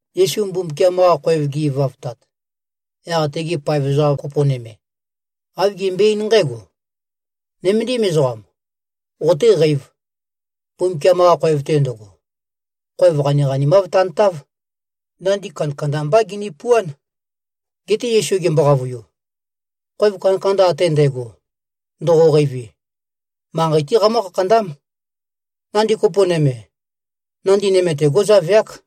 Yesu Mbumbukiam-qa khoev ge꞉-ivavtat, yaq tege paev ezoqa kopo nøme, āv gembøe-eín nqǽgo, “Nøméndim ezoqam. Qotéqēiv! Mbumbukiam-qa khoev-te ndøgo, khoev qaniqanimáv tantáv. Nandi kandakanda mbá ginipuán.” Geté Yesu gembo-qavøiu, “Khoev kandakanda ate ndægo, ndoqoqeivi, manqei-té qamǿ-khakhandám. Nandi kopo nøme, nandi nøme-te, gó꞉zaveák.”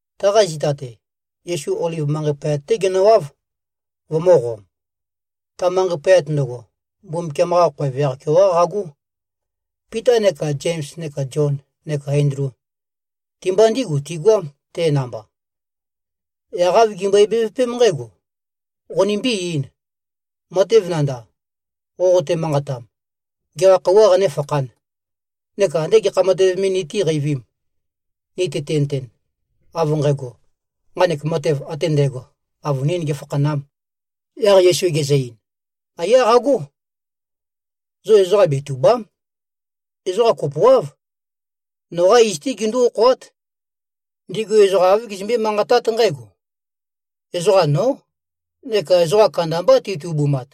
Taqa zita-te, Yesu Oliv manqei poyat-té genøwáv, vømø̄qom. Ta manqei poyat ndøgo, Mbumbukiam-qa khoev yaq-keoqá qagó. Pita neka Zems neka Zion neka Endlu, ti-mba ndígu tigoám, te namba. Yaq āv gimbøe-bevøpém nqǽgo, “Qonimbí-eīn. Matev nandav, qoqote-manqatam, gekha khøuwā qanéfakhān? Neka andé gekha matev me nitíqeivīm, ni tøtinøten, av nqægo, nqanek matev ate ndægo avønīn gēfakhanām?” Yaq Yesu gezø-ein, “Aiyá qagó. Zo ezoqa betùba᷄m. Ezoqa kopoáv, noqá iz-té gindú-okhoát. Ndigu ezoqa āv gizømbé-manqatát nqǽgo, ‘Ezoqa, nó’, neka ezoqa kandambá titubumat.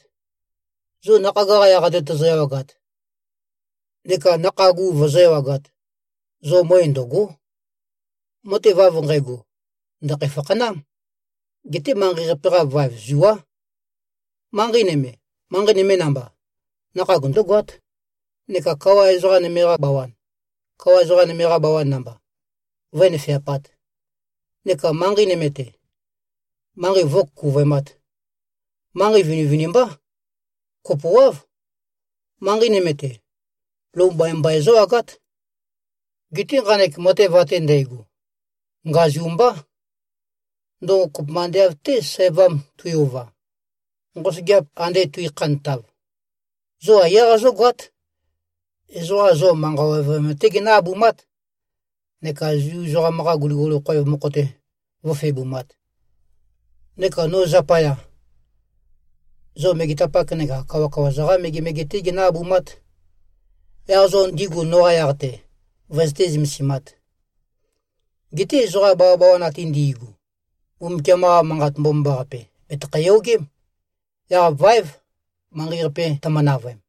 Zo nakhag-qa yaq-te tozo-ewagat neka nakhag u vozó-ewagāt, zo møe ndø̀go᷄. Matev av nqægo, ndø̀khæ-fakhanám. Geté manqei-qape-qa vaev zuá. Manqei nøme, manqei nøme namba, nakhag ndǿgoát, neka kawa ezoqa nøme-qa bawan, kawa ezoqa nøme-qa bawan namba, vǿnøfeapāt, neka manqei nøme-te, manqei vǿkukuvøemāt. Manqei vinivinimbá. Kopoáv. Manqei nøme-te, lou mbaimbai zǿwagát. Geté nqanek matev ate ndægo, ngazu mbá. Ndøgo kopømba ande av-té, sævam tui-ova, nqosøgeap ande tuikhantav. Zo aiyá qazógoát. Ezoqa zo manqa ovøyam-té ginǿ-abumát neka Zu ezoqam-qa guliguli khoev mokho-te vǿfebumāt. Neka no zapaya, zo megetapak neka kawakawa-za-qá megemege-té ginǿ-abumát, yaq zo ndigu noqa yaq-te vøzøté-zømasāt. Geté ezoqa bawabawan ate ndi꞉gu, Mbumbukiam-qa Manqat Mbomambaqape bètøkhæ-yogém, yaq váev manqei-qape tømø-navøem.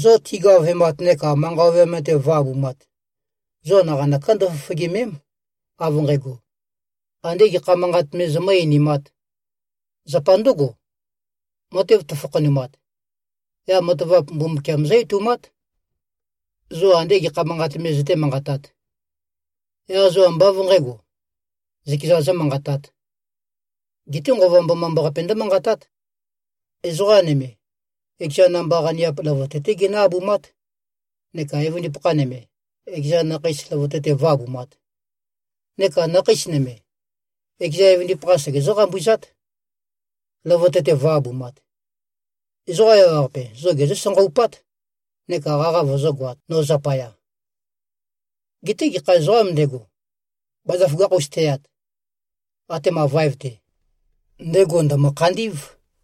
Zo tigavemat neka manqa ovøyam-te vǿ-abumāt, zo naqanøká ndøfofogème᷄m, av nqægo, andē gekha manqat me zomǿ-einimāt. Zapa ndǿgo, matev tøfakhanumat, yaq matavap Mbumbukiam zǿ-etoumát, zo andé gekha manqat me zøté-manqatāt. Yaq zo ambá av nqǣgo, zøkezan zómanqatāt. Geté Nqova Mbomambaqape ndǿmanqatát. Ezoqa nøme, ekeza namba-qaniap løvøte-té ginǿ-abumát neka evøndipakha nøme, ekeza nakheis løvøte-te vǿ-abumāt. Neka nakheis nøme, ekeza evøndipakha segezǿ-qambuzát, løvøte-te vǿ-abumāt. Ezoqa ewaqape zo gésanqabát neka qaqa vøzǿgoāt, no zapaya. Geté gekha ezoqām ndego, bazaføgakh-us teyat, atema vaev-te, ndego ndø̀mø-khandí꞉v.”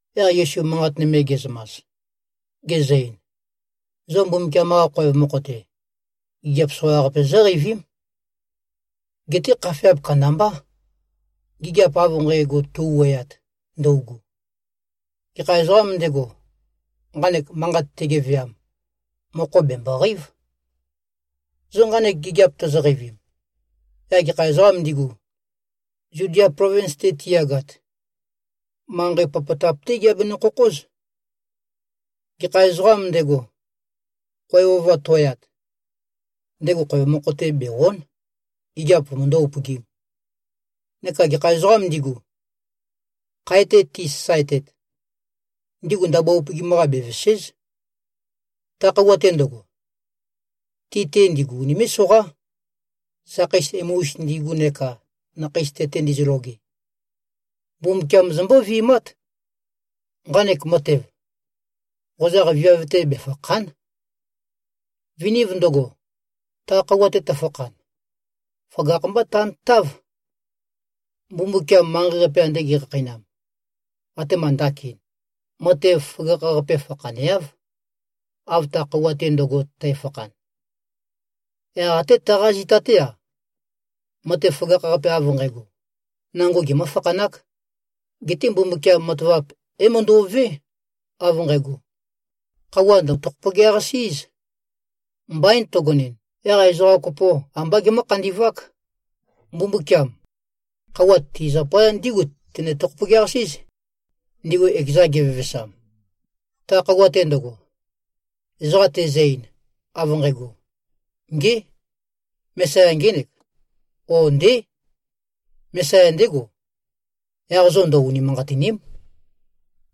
Yaq Yesu manqat nøme ge꞉zømas, gezø-ein, “Zo Mbumbukiam-qa khoev mokho-te, gigiap soqaqape zóqeivím. Geté khafeap kandambá, gigiap av nqægo tøu-wuøyat ndøugu. (Gekha ezoqām ndego, nqanek manqat tegeveam, mokho bèmboqeív.) Zo nqanek gigiap tozoqeivim, yaq gekha ezoqām ndigu, Zudia plovins-te tiyagat, manqei popotap-té giabenø-khokhóz. Gekha ezoqām ndego, khoev ova to꞉yat, ndego khoev mokho-te bè-o᷄n, gigiap vømøndó-upøgīm. Neka gekha ezoqām ndigu, khae-te tisasaetet, ndigu ndabua upøgim-qa bevèse᷄z. Ta khøuwa-te ndøgo, ti-te ndigu unimé꞉-soqá, sakheis emu-us ndigu neka nakhei tete ndizøloge. Mbumbukiam zombó-vi꞉mát. Nqanek matev, qozaq viav-te befàkha᷄n. Viniv ndøgo, ta khøuwa-te tøfakhan, føgakh-mbá tantáv. Mbumbukiam manqei-qape ande ge꞉khakheinam, atema ndakin, matev føgakh-qape fakhaneáv, av ta khøuwa-te ndøgo tæfakhan. Yaq até taqa zita-té-a, matev føgakh-qape av nqægo, nango gemǿ-fakhanák. Geté Mbumbukiam matavap é-møndo꞉vé, av nqægo, khøuwa ndø̀-tokhopogeaqasí꞉z. Mbain tøgonɨn, yaq ezoqa kopo ambá gemǿ-khandi꞉vák. Mbumbukiam, khøuwa, ti zapaya ndígu tené-tokhopogeaqasí꞉z, ndigu ekezan gevevesam. Ta khøuwa-te ndøgo, ezoqa tezø-ein, av nqægo, ‘Ngé! Mesaya ngének,’ ó, ‘Ndé. Mesaya ndégo,’ yaq zo ndø-unimanqatìni᷄m.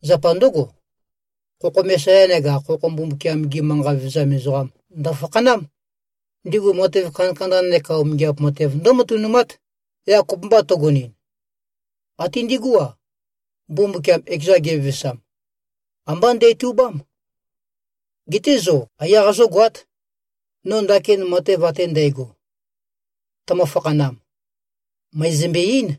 Zapa ndǿgo, khokho Mesaya neka khokho Mbumbukiam-gi manqa vevezam ezoqam ndø̀fakhanám. Ndigu matev kandakanda neka umingiap matev ndǿmatønumát. Yaq kopømba tøgønɨn, até ndigú-a, Mbumbukiam ekezan gevevesam, ambá ndætubám. Geté zo aiyá qazógoát. No ndakin matev ate ndægo, tømø-fakhanam, mø̀ezømbe-eín.”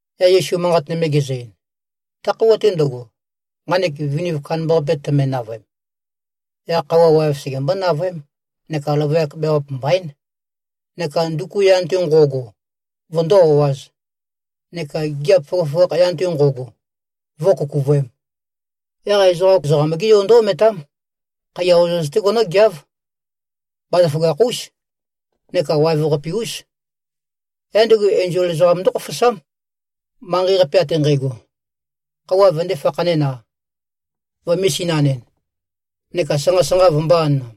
Yaq Yesu manqat nøme gezø-ein, “Ta khøuwa-te ndøgo, nqanek viniv kandambaqape tøme-navøem, yaq khøuwa waev segembó-navøém, neka løvøyak beawap mbaín, neka nduku yan-te ngo꞉go vøndó-o꞉āz, neka gigiap føgøføgakh yan-te nqo꞉go, vǿkukuvøēm. Yaq ezoqa Ezoqam-gé Yo ndǿ-ometám. Khaiya ozoz-té genǿgeáv. Bazaføgakh-ús neka waev-qape-ús. Yaq ndego enzol ezoqam ndókhofosám, manqei-qape ate nqægo, khøuwa vøndē-fakhanɨn-a, vømē-sinanɨn, neka sanqa-sanqa vømbō-anam.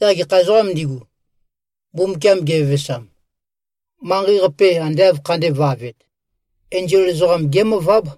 Yaq gekha ezoqām ndigu, Mbumbukiam gevevesam, manqei-qape ande āv khandēvavet, enzol ezoqam gémøváb.”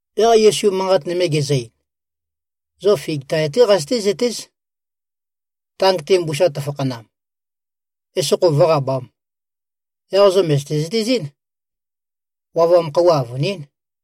Yaq Yesu manqat nøme gezø-ein, “Zo fig tae-té qazøté-zøtéz. Tang-te mbusa tøfakhanam, esokho vǿqabām, yaq zo mø̀zøte-zøtezɨ́n, wavam khøuwa avønín.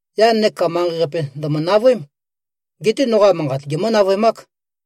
Yan neka manqei-qape ndø̀mø-navøém. Geté noqa manqat gemǿ-navøemák.”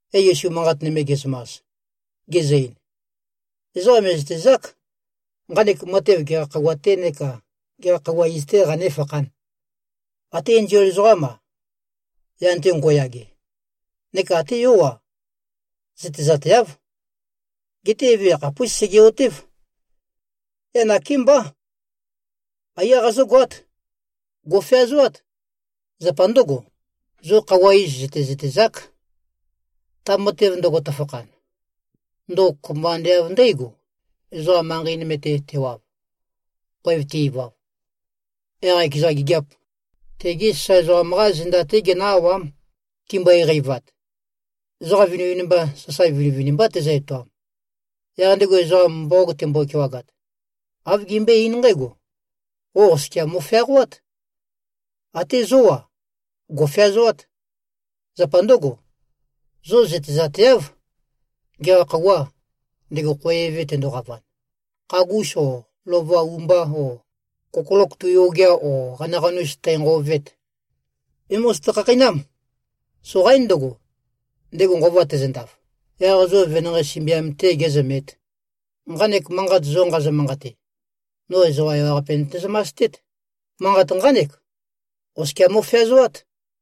Yaq Yesu manqat nøme ge꞉zømas, gezø-ein, “Ezoqa mè꞉zøtezák, nqanek matev gekha khøuwa-tē neka gekha khøuwa iz-tē qanéfakhān. Até enzol ezoqám-a, yan-te ngo꞉yage, neka até Yó-a, zøtezateáv. Geté Eve yakhapús sege꞉-otév. Yaq nakémbá. Aiyá qazógoát. Gò꞉feazoát. Zapa ndǿgo, zo khøuwa iz zø̀tezøtezák, ta matev ndøgo tøfakhan. Ndøgo kopømba ande av ndǽgo, ezoqam manqei nøme-te tewav. Khoev te-ivav, yaq ekeza gigiap, tegi sasae ezoqam-qá zenda-té genǿ-awám, timbøe-qeivat. Ezoqa vinivinimba, sasae vinivinimbá tezø-etoam. Yaq ndego ezoqam mboqog tembo-kewagat, āv gembøé-eín nqǽgo, ‘Qo oskia mo꞉feaqoát.’ Até zó-a, gò꞉feazoát. Zapa ndǿgo, zo zøtezateáv, gekha khøuwâ, ndego khoev eve tendoqavan, khagūs o lova u-mbā, o kokolok tui-ogea o qanaqanus tænqovet. É-mozoto-khakheinám. Soqaín ndøgo, ndego nqova tezøndaf, yaq zo venanqei sømbiam-tē gēzømēt. Nqanek manqat zo nqazø-manqate, no ezoqa ewaqape nøte-zømastét. Manqat nqánek: Oskia mo꞉feazoát!”